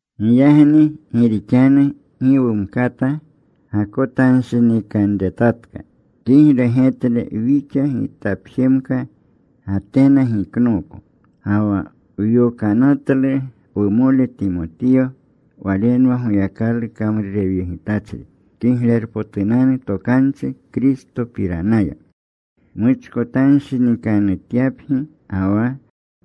Giyagni gi rixanu gi wumkata gakotanshinikanretatka, kigle getle wixa gitapjemka Gatena giknooko. Ga wa wyokanatlu wumole Timotiyo. Walenwa Goyakalu kamrurewyegitachri Kiglerpotunanu Tokanchi Kristopiranaya, muchkotanshinikanutyapgi ga wa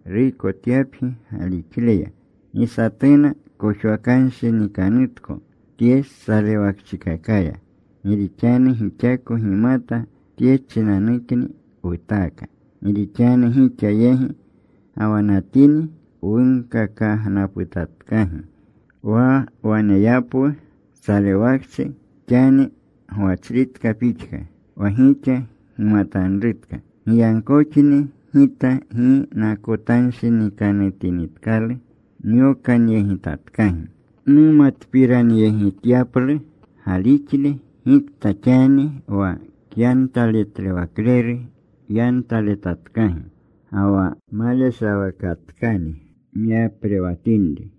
ruykotyapgi galixleya. Gi satuna kojwakanshinikanutko tye salewakchikakaya. Gi rixanu gixako gimata tye chinanukni wutaaka. Gi rixanu gixa yegi gawanatini, wunkakagnaputatkagi wa waneyapwu salewakchi, xani gwachritka pixka, wa gixa gimatanrutka. Giyagkoxni gita gi nakotanshinikanutinitkalu. Nyokanyegitatkagi numatpiranyegityaplu galixle, gikta xani wa kyantaletlewakleru yantaletatkagi, ga wa maleshawakatkani wyaprewatinri.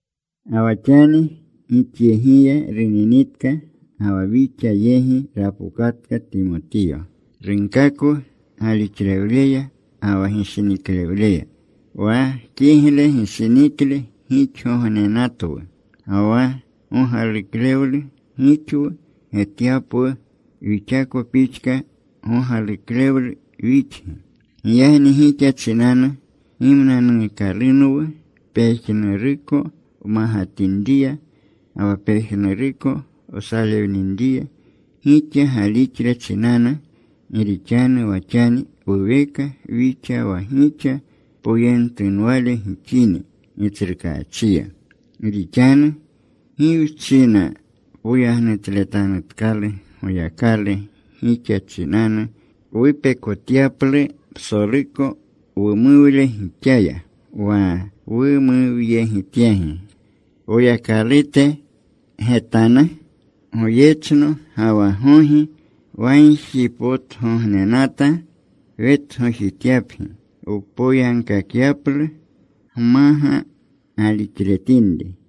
Ga wa xani gixyegiya runinitka ga wa wixa yegi rapokatka Timotiyo. Runkakwu galixlewleya ga wa gishiniklewleya. Wa kigle gishinikle gixgognenatwu. Ga wa gogaluklewlu gixwu getyapwu, wixako pixka gogaluklewlu wixgi. Giyagni gixa chinanu gimnanuukalunwu pejnuruko wmagatinriya ga wa pejnuruko wsalewninriya, gixa galixle chinanu. Gi rixanu wa xani wuweka wixa wa gixa poyentunwale gixini Gitsrukaachiya. Gi rixanu ¿gi wchina poyagnutletanutkalu Goyakalu gixa chinanu, wupekotyaplu psoluko wumuwle gixaya wa wumuwyegityagi Woyakalute getanu? Goyechno ga wa gogi wagjipotgognenata wetgojityapgi, wpoyagkakyaplu gmaga galixletinri.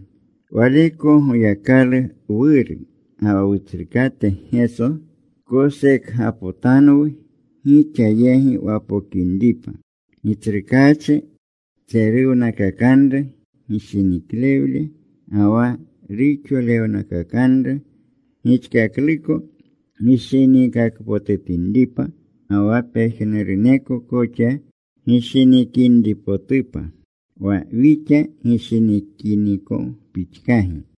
Waleko Goyakalu Wuru, ga wa Wutsrukate Geso kosekgapotanwu, gixa yegi wapokinripa. Gitsrukaachi tseruwnakakanru gishiniklewle ga wa ruxolewnakakanru, gixkakluko gishiniikakpotutinripa ga wa pejnuruneko koxa gishinikinripotupa, wa wixa gishinikiniko pixkagi.